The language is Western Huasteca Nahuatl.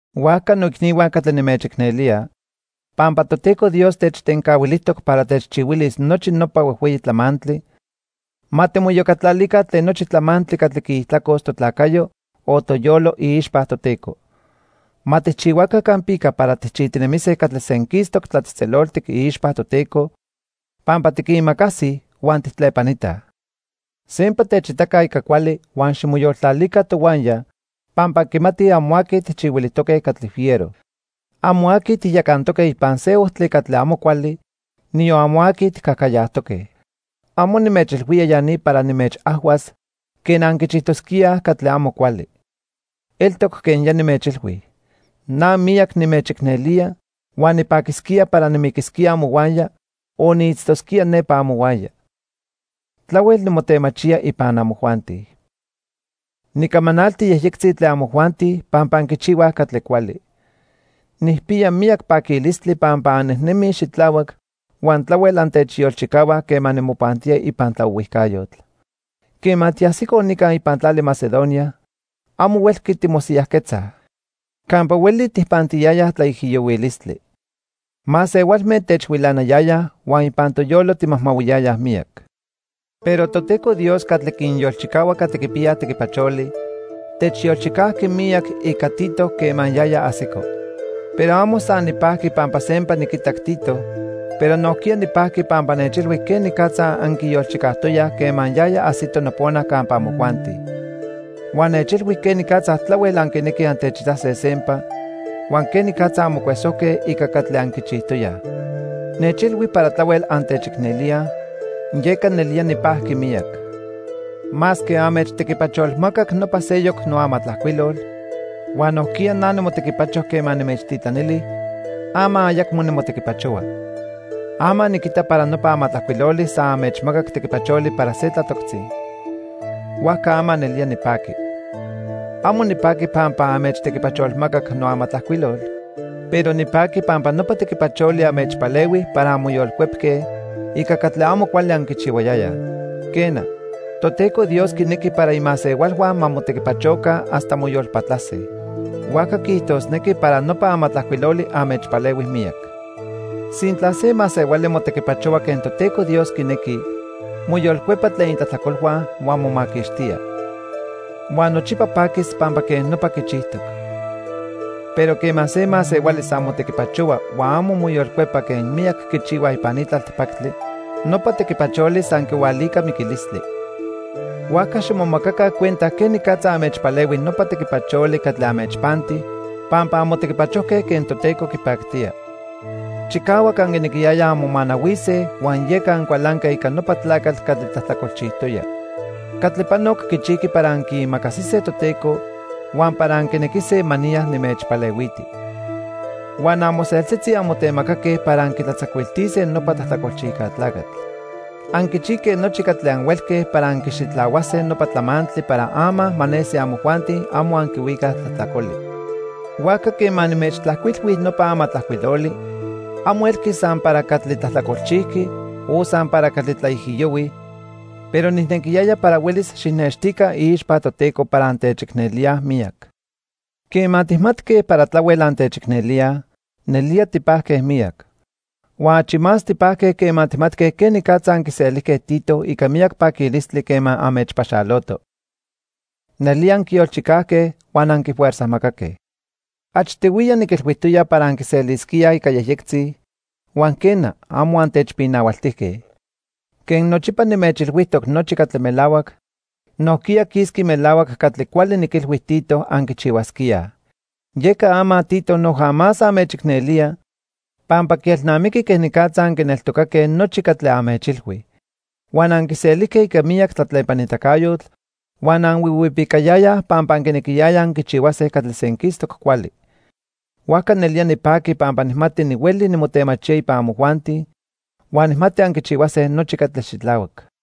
Huajca noicnihua catli nimechicnelía, pampa Toteco Dios techtencahuilijtoc para techchihuilis nochi nopa huejhueyi tlamantli, ma timoiyocatlalica tlen nochi tlamantli catli quiijtlacos totlacayo o toyolo iixpa Toteco. Ma tijchihuaca campica para tijchijtinemise catli senquistoc tlatzejtzeloltic iixpa Toteco pampa tiquimacasij huan tijtlepanitaj. Sempa techitaca ica cuali huan ximoyoltlalica tohuaya pampa anquimatij amo aqui tijchihuilijtoque catli fiero. Amo aqui tijyacantoque ipan se ojtli catli amo cuali, niyon amo aqui tijcajcayajtoque. Amo nimechilhuía ya ni para nimechajhuas quen anquichijtosquíaj catli amo cuali. Eltoc quen ya nimechilhui. Na miyac nimechicnelía huan nipaquisquía para nimiquisquía amohuaya o niitztosquía nepa amohuaya. Tlahuel nimotemachía ipan amojuanti. Nicamanalti yejyectzi tlen amojuanti pampa anquichihuaj catli cuali. Nijpiya miyac paquilistli pampa annejnemij xitlahuac huan tlahuel antechyolchicahuaj quema nimopantía ipan tlaohuijcayotl. Quema tiajsicoj nica ipan tlali Macedonia, amo huelqui timosiyajquetzaj. Campa hueli tijpantiyayaj tlaijiyohuilistli. Masehualme techhuilanayayaj huan ipan toyolo timajmahuiyayaj miyac. Pero Toteco Dios catli quinyolchicahua catli quipiyaj tequipacholi, techyolchicajqui miyac ica Tito quema yaya ajsico. Pero amo san nipajqui pampa sempa niquitac Tito, pero nojquiya nipajqui pampa nechilhui quenicatza anquiyolchicajtoyaj quema yaya ajsito nopona campa amojuanti. Huan nechilhui quenicatza tlahuel anquinequij antechitase sempa, huan quenicatza anmocuesojque ica catli anquichijtoyaj. Nechilhui para tlahuel antechicnelíaj, yeca nelía nipajqui miyac. Masque anmechtequipacholmacac nopa seyoc noamatlajcuilol, huan nojquiya na nimotequipacho quema nimechtitlanili, ama ayacmo nimotequipachohua. Ama niquita para nopa amatlajcuiloli san anmechmacac tequipacholi para se tlatoctzi. Huajca ama nelía nipaqui. Amo nipaqui pampa anmechtequipacholmacac noamatlajcuilol, pero nipaqui pampa nopa tequipacholi anmechpalehui para anmoyolcuepque ica catli amo cuali anquichihuayayaj. Quena, Toteco Dios quinequi para imasehualhua ma motequipachoca hasta moyolpatlase. Huajca quiijtosnequi para nopa amatlajcuiloli anmechpalehui miyac. Sintla se masehuali motequipachohua quen Toteco Dios quinequi, moyolcuepa tlen itlajtlacolhua, huan momaquixtía. Huan nochipa paquis pampa quej nopa quichijtoc. Pero quema se masehuali san motequipachohua huan amo moyolcuepa quen miyac quichihuaj ipan ni tlaltipactli, nopa tequipacholi san quihualica miquilistli. Huajca ximomacaca cuenta quenicatza anmechpalehui nopa tequipacholi catli anmechpanti pampa anmotequipachojque quen Toteco quipactía. Chicahuac anquinequiyayaj anmomanahuise huan yeca ancualanque ica nopa tlacatl catli tlajtlacolchijtoya. Catli panoc quichijqui para anquiimacasise Toteco huan para anquinequise ma niya nimechpalehuiti. Huan amoseltzitzi anmotemacaque para anquitlatzacuiltise nopa tlajtlacolchijca tlacatl. Anquichijque nochi catli anhuelque para anquixitlahuase nopa tlamantli para ama ma nesi amojuanti amo anquihuicaj tlajtlacoli. Huajca quema nimechtlajcuilhui nopa amatlajcuiloli, amo elqui san para catli tlajtlacolchijqui o san para catli tlaijiyohui, pero nijnequiyaya para huelis xijnextica iixpa Toteco para antechicnelíaj miyac. Quema tijmatque para tlahuel antechicnelíaj, nelía tipajque miyac. Huan achi más tipajque quema tijmatque quenicatza anquiselijque Tito ica miyac paquilistli quema anmechpaxoloto. Nelía anquiyolchicajque huan anquifuerzajmacaque. Achtihuiya niquilhuijtoya para anquiselisquíaj ica yejyectzi, huan quena, amo antechpinahualtijque. Quen nochipa nimechilhuijtoc nochi catli melahuac, nojquiya quisqui melahuac catli cuali niquilhui Tito anquichihuasquíaj. Yeca ama Tito noja más anmechicnelía pampa quielnamiqui quenicatza anquineltocaque nochi catli anmechilhui. Huan anquiselijque ica miyac tlatlepanitacayotl huan anhuihuipicayayaj pampa anquinequiyayaj anquichihuase catli senquistoc cuali. Huajca nelía nipaqui pampa nijmati nihueli nimotemachía ipan amojuanti, huan nijmati anquichihuase nochi catli xitlahuac.